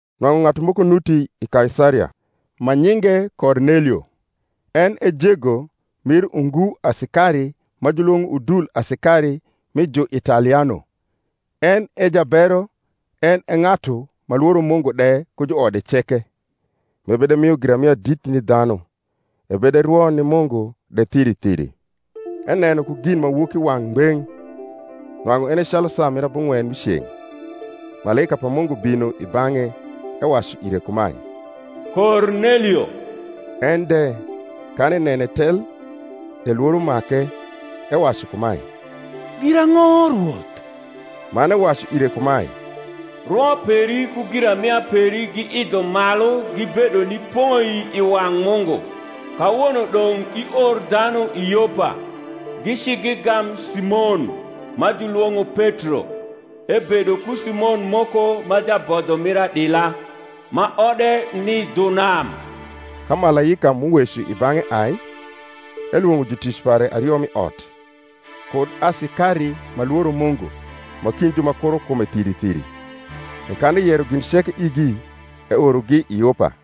Nwang’u ng’atu moko nuti i Kaisaria, ma nyinge Kornelio, en e jego mir ungu asikari ma julwong’o udul asikari mi Juitaliano, en e jabero, en e ng’atu ma lworo Mungu de ku juode ceke, m’ebedemio giramia dit ni dhanu, ebederwo ni Mungu de thiri thiri. Eneno ku ginmawokiwang’ ngbeng’, nwang’u ene calu saa mir abung’wen mi ceng’, malaika pa Mungu bino i bang’e, ewacu ire kumae, Kornelio. En de, kan enene tel, e lworo make, ewacu kumae, Girang’o, Rwoth? Man ewacu ire kumae, Rwo peri ku giramia peri giidho malu gibedo ni poi i wang’ Mungu. Kawono dong’ ior dhanu i Yopa, gici gigam Simon, ma j ulwong’o Petro: ebedo ku Simon moko ma jabodho mir adila, ma ode ni dhu nam. Ka malaika m’uweco i bang’e ai, elwong’o jutic pare ario m’i ot, kud asikari ma lworo Mungu ma kind ju ma kuro kume thiri thiri; e kan eyero gin ceke igi, eorogi i Yopa.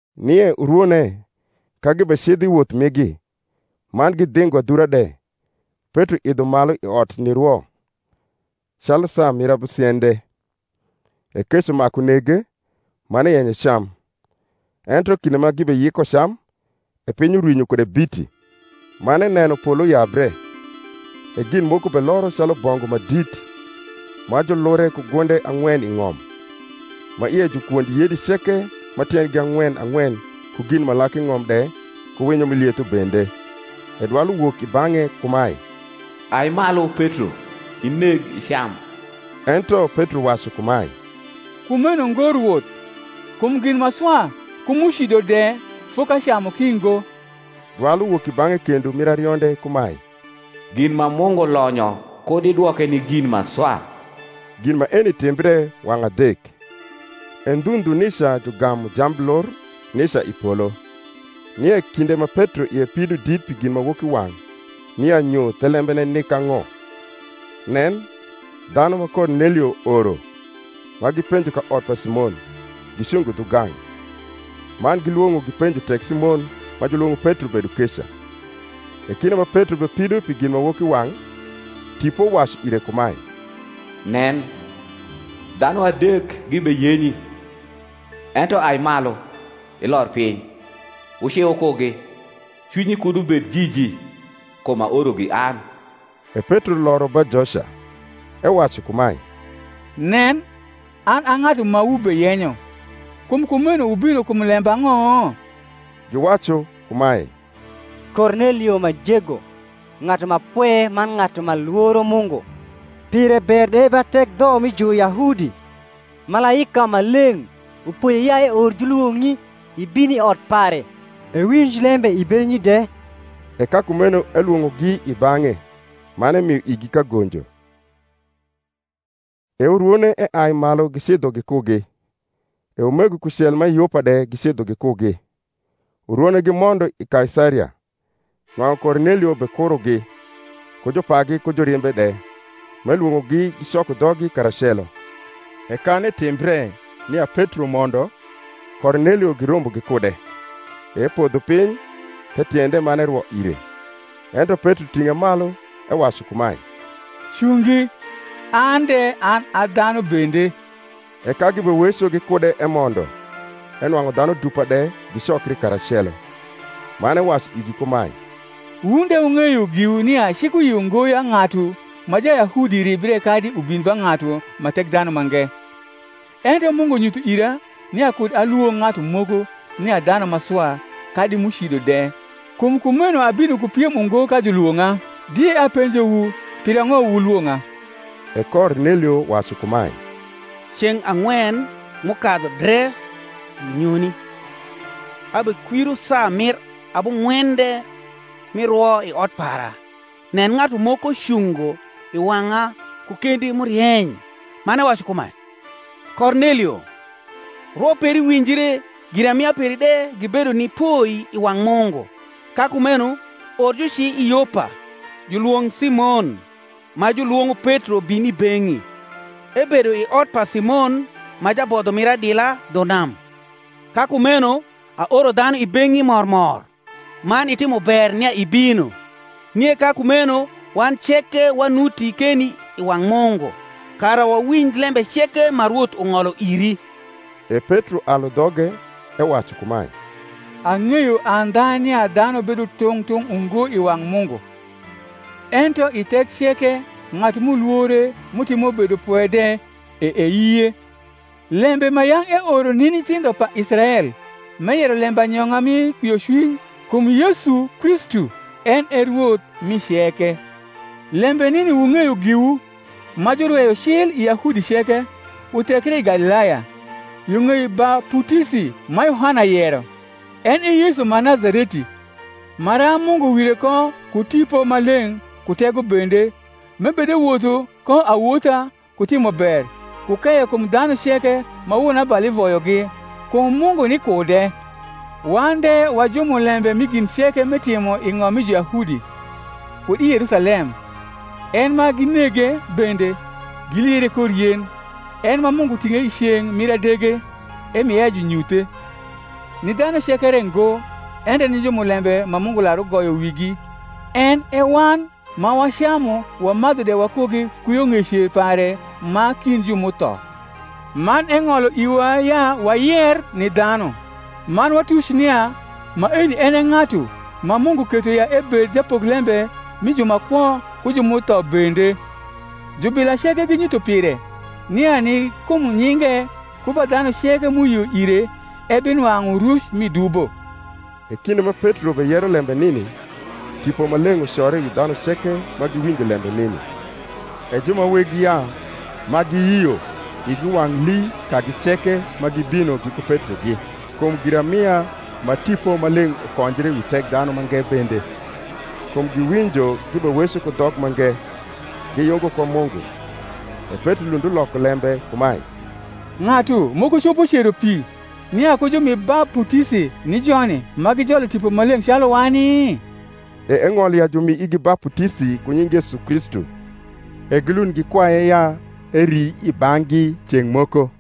Nie urwone, ka gibecidho i woth migi, man gidhingo adhura de, Petro idho malu i ot nirwo, calu saa mir abusiende: e kec umaku nege, man eyenyo ecam: ento kinde ma gibeyiko cam, e piny urwinyo kude biti; man eneno polo yabre, e gin moko beloro calu bongu ma dit, ma julure ku gunde ang’wen i ng’om: ma ie ju kwond yedi ceke ma tiendgi ang’wen ang’wen ku gin ma lak i ng’om de ku winyo m’i lietho bende. E dwai uwok i bang’e kumae, Ai malu, Petro; ineg icam. Ento Petro wacu kumae, Kumeno ngo, Rwoth; kum gin ma swa ku m’ucido de fokacamu ki ngo. Dwal uwok i bang’e kendo mir arionde kumae, Gin ma Mungu lonyo kud idwoke ni gin ma swa. Gin maeni timbre wang’ adek: e ndhu ndhu nica jugamu jamblur nica i polo. Nie kinde ma Petro ie pido dit pi ginmawokiwang’ nia nyo thelembene nik ang’o, nen, dhanu ma Kornelio oro, ma gipenjo ka ot pa Simon, gicungo dhugang’, man gilwong’o gipenjo tek Simon ma julwong’o Petro bedo keca. E kinde ma Petro bepido pi ginmawokiwang’, Tipo wacu ire kumae, Nen, dhanu adek gibeyenyi. Ento ai malu, ilor piny, wuci wukugi, cwinyi kud ubed jiji: kum aorogi an. E Petro loro ba joca, ewacu kumae, Nen, an a ng’atu ma wubeyenyo: kum kumeno wubino kum lembang’o? Giwacu kumae, Kornelio ma jego, ng’atu ma pwe man ng’atu ma lworo Mungu, pire ber de ba thek dho mi Juyahudi, malaika ma leng’ upoye ya eor julwong’i ibin i ot pare, ewinj lembe i beng’i de. E ka kumeno elwong’ogi i bang’e man emio igi kagonjo. E urwone eai malu gicidho gikugi, e umego kucel ma i Yopa de gicidho gikugi. Urwone gimondo i Kaisaria. Nwang’u Kornelio bekurogi, ku jupagi ku jurimbe de m’elwong’ogi gicoko dhoggi karacelo. E kan etimbre nia Petro mondo, Kornelio girombo gikude, e epodho piny the tiende, man erwo ire. Ento Petro ting’e malu, ewacu kumae, Cungi; an de an a dhanu bende. E ka gibeweco gikude emondo, enwang’u dhanu dupa de gicokri karacelo: man ewacu igi kumae, Wun de wung’eyo giwu nia cik uyio ngo ya ng’atu ma Jayahudi ribre kadi ubin ba ng’atu ma Thekdhanumange; ento Mungu nyutho ira nia kud alwong’ ng’atu moko nia dhanu ma swa kadi m’ucido de: kum kumeno abino ku piem ungo ka julwong’a. Die apenjowu pirang’o wuIwong’a. E Kornelio wacu kumae, Ceng’ ang’wen m’ukadhu dre unyoni, abekwiro saa mir abung’wende mi rwo i ot para; nen, ng’atu moko cungo i wang’a ku kendi m’urieny, man ewacu kumae, Kornelio, rwo peri winjre giramia peri de gibedo ni poi i wang’ Mungu. Ka kumeno or juci i Yopa, julwong’ Simon, ma julwong’o Petro bin i beng’i; ebedo i ot pa Simon ma jabodho mir adila, dhu nam. Ka kumeno aoro dhanu i beng’i mor mor; man itimo ber nia ibino. Nie ka kumeno wan ceke wanuti keni i wang’ Mungu, kara wawinj lembe ceke ma Rwoth ung’olo iri. E Petro alu dhoge, ewacu kumae, Ang’eyo andha nia dhanu bedo tung’ tung’ ungo i wang’ Mungu: ento i thek ceke ng’atu m’ulwore, m’utimo bedopwe de, e eyie. Lembe ma yang’ eoro ni nyithindho pa Israel m’eyero lembanyong’a mi kwiocwiny kum Yesu Kristu (en e Rwoth mi ceke) lembe nini wung’eyo giwu, ma jurweyo cil i Yahudi ceke, uthekre i Galilaya, yo ng’ei baputisi ma Yohana yero; en e Yesu ma Nazareti, maram Mungu wire ko ku Tipo Maleng’ ku tego bende: m’ebedewotho ko awotha ku timo ber, ku keyo kum dhanu ceke ma wonabali voyogi; kum Mungu ni kude. Wan de wa jumulembe mi gin ceke m’etimo i ng’om mi Juyahudi, kud i Yerusalem; en ma ginege bende, giliere kor yen. En ma Mungu ting’e i ceng’ mir adege, emie ya junyuthe, ni dhanu ceke re ngo, ento ni jumulembe ma Mungu lar ugoyo wigi, en e wan, ma wacamu wamadhu de wakugi ku yo ng’ei cer pare ma kind ju m’utho. Man eng’olo iwa ya wayer ni dhanu, man watuc nia maeni en e ng’atu ma Mungu ketho ya ebed japoklembe mi ju ma kwo ku ju m’utho bende. Jubila ceke ginyutho pire, nia ni kum nyinge ku ba dhanu ceke m’uyio ire ebinwang’u ruc mi dubo. E kinde ma Petro beyero lembe nini, Tipo Maleng’ ucore wi dhanu ceke ma giwinjo lembe nini. E ju ma weg yaa ma giyio igi wang’ lii, kagi ceke ma gibino giku Petrogi, kum giramia ma Tipo Maleng’ ukonjre wi Thekdhanumange bende. Kum giwinjo gibeweco ku dhok mange, giyungo ko Mungu. E Petro lund uloko lembe kumae, Ng’atu moko copo cero pi, nia ku jumi baputisi ni joni, ma gijolo Tipo Maleng’ calu wani? E eng’olo ya jumi igi baputisi ku nying Yesu Kristu. E gilund gikwaye ya eri i bang’gi ceng’ moko.